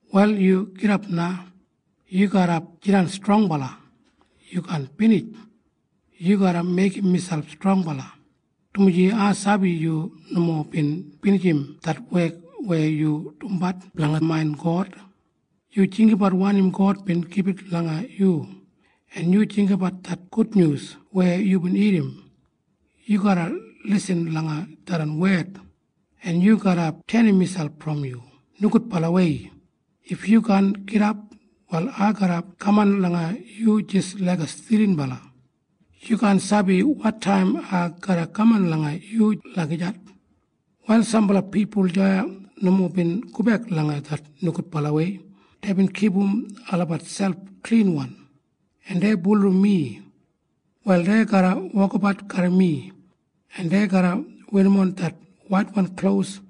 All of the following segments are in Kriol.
Wal yu gidap na! Yu garra jidan strongbala. Yu kaan binij. Yu garra meigim miselp strongbala, dumaji ai sabi yu nomo bin binijim det wek weya yu dumbat blanga main God. Yu jinggabat wanim God bin gibit langa yu. En yu jinggabat det gudnyus weya yubin irrim. Yu garra lisin langa tharran wed, en yu garra tenim miselp brom yu nogudbalawei. If yu kaan gidap, wal ai garra kaman langa yu jis laiga stilinbala. Yu kaan sabi wotaim ai garra kaman langa yu lagijat. “Wal sambala pipul deya nomo bin gobek langa det nogudbalawei. Deibin kipum olabat selp klinwan, en dei bulurrum mi. Wal dei garra wokabat garram mi, en dei garra werrimon det waitwan klos.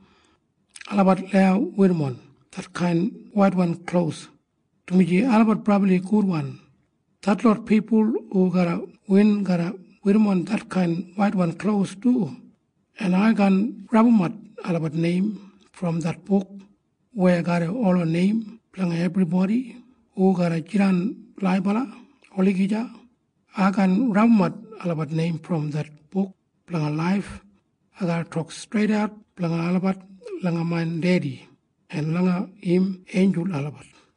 Olabat lau werrimon detkain waitwan klos, dumaji olabat brabli gudwan. Detlot pipul hu garra win garra werrimon detkain waitwan klos du, en ai kaan rabumat olabat neim brom det buk weya garram ola neim blanga ebribodi hu garra jidan laibala olagija. Ai kaan rabumat olabat neim brom det Buk Blanga Laif. Ai garra tok streidat blanga olabat langa main Dedi en langa im einjul olabat.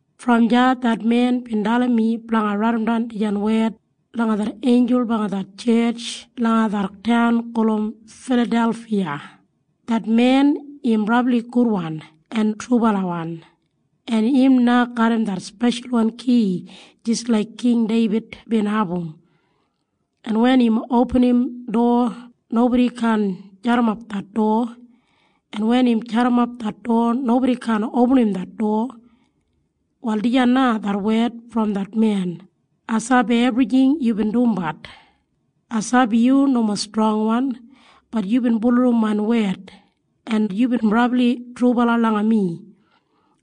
Brom deya det men bin dalim mi blanga raidimdan dijan wed langa det einjul blanga det tjetj langa det taun gulum Filadelfiya. Det men im brabli gudwan en trubalawan, en im na garram det speshalwan ki jis laik King Deibid bin abum. En wen im opinim dowa, nobodi kaan jadimap det dowa. En wen im jadimap det dowa, nobodi kaan opinim det dowa. Wal dijan na det wed brom det men, “Ai sabi ebrijing yubin dumbat. Ai sabi yu nomo strongwan. Bat yubin bulurrum main wed, en yubin brabli trubala langa mi.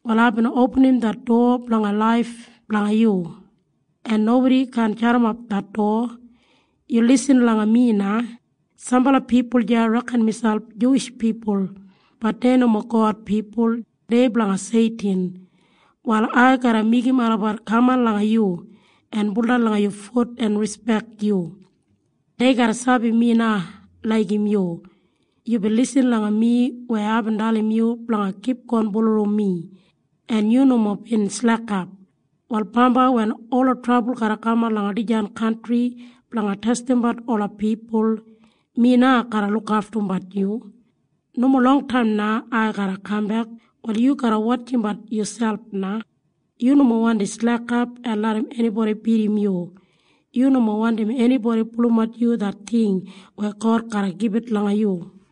Wal aibin opinim det dowa blanga laif blanga yu, en nobodi kaan jadimap det dowa. “Yu lisin langa mi na. Sambala pipul deya reken miselp Juwish pipul. Bat dei nomo God pipul. Dei blanga Seitin. Wal ai garra meigim olabat kaman langa yu en baudan langa yu fut en rispek yu. Dei garra sabi mi na laigim yu. Yubin lisin langa mi weya aibin dalim yu blanga kipgon bulurrum mi, en yu nomo bin slekap. Wal bambai wen ola trabul garra kaman langa dijan kantri blanga testimbat ola pipul, mi na garra lukaftumbat yu. “Nomo longtaim na ai garra kambek. Wal yu garra wotjimbat yuselp na. Yu nomo wandi slekap en larram enibodi bidim yu. Yu nomo wandim enibodi pulumat yu det ting weya God garra gibit langa yu.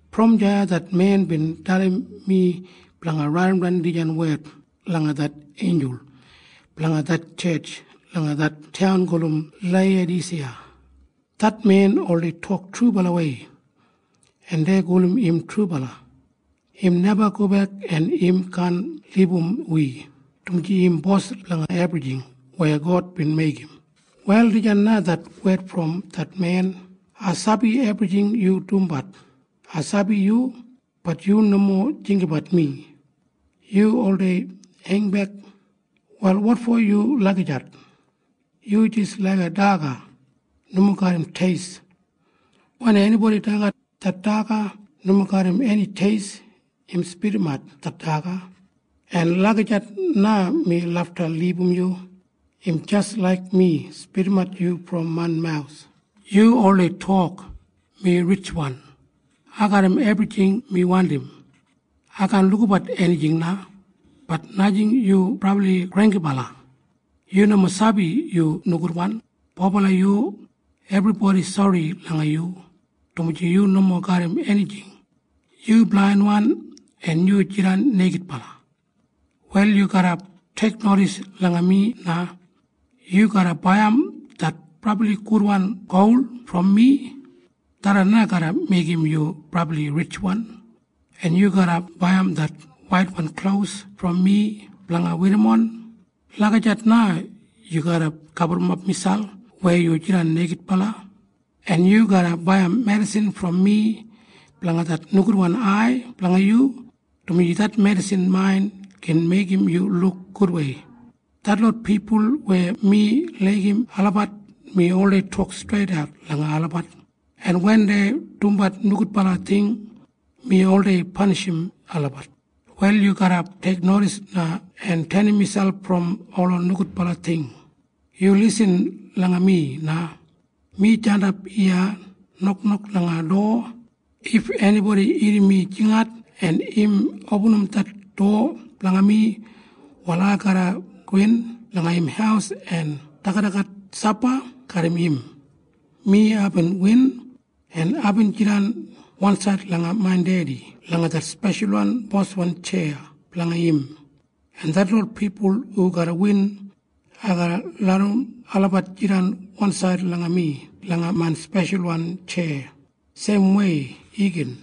Brom deya det men bin dalim mi blanga raidimdan dijan wed langa det einjul blanga det tjetj langa det taun gulum Leiyadasiya. Det men oldei tok trubalawei, en dei gulum im Trubala. Im neba gobek en im kaan libum wi, dumaji im Bos blanga ebrijing weya God bin meigim. Wal dijan na det wed brom det men, “Ai sabi ebrijing yu dumbat. Ai sabi yu. Bat yu nomo jinggabat mi. Yu oldei heingbek. Wal wotfo yu lagijat? Yu jis laiga daga nomo garram teist. Wen enibodi dagat det daga nomo garram eni teist, im spidimat det daga. En lagijat na mi lafta libum yu. Im jis laik mi spidimat yu brom main mawus. “Yu oldei tok, ‘Mi ritjwan. Ai garram ebrijing mi wandim. Ai kaan lukabat enijing na.’ Bat najing. Yu brabli granggibala! Yu nomo sabi yu nogudwan, bobala yu. Ebribodi sori langa yu, dumaji yu nomo garram enijing. Yu blainwan, en yu jidan neigidbala. “Wal yu garra teiknodis langa mi na. Yu garra baiyim det brabli gudwan gol brom mi. Tharran na garra meigim yu brabli ritjwan. En yu garra baiyim det waitwan klos brom mi blanga werrimon. Lagijat na yu garra gaburrumap miselp weya yu jidan neigidbala. En yu garra baiyim medisin brom mi blanga det nogudwan ai blanga yu, dumaji det medisin main gin meigim yu luk gudwei. Detlot pipul weya mi laigim olabat, mi oldei tok streidat langa olabat, en wen dei dumbat nogudbala ting, mi oldei panishim olabat. “Wal yu garra teiknodis na en tenim miselp brom ola nogudbala ting. “Yu lisin langa mi na. Mi jandap iya noknok langa dowa. If enibodi irrim mi jingat, en im opinim det dowa blanga mi, wal ai garra gowin langa im haus en dagadagat sapa garram im. Mi aibin win, en aibin jidan wansaid langa main Dedi langa det speshal boswan tjeya blanga im. En detlot pipul hu garra win, ai garra larram olabat jidan wansaid langa mi langa main speshalwan tjeya seimwei igin.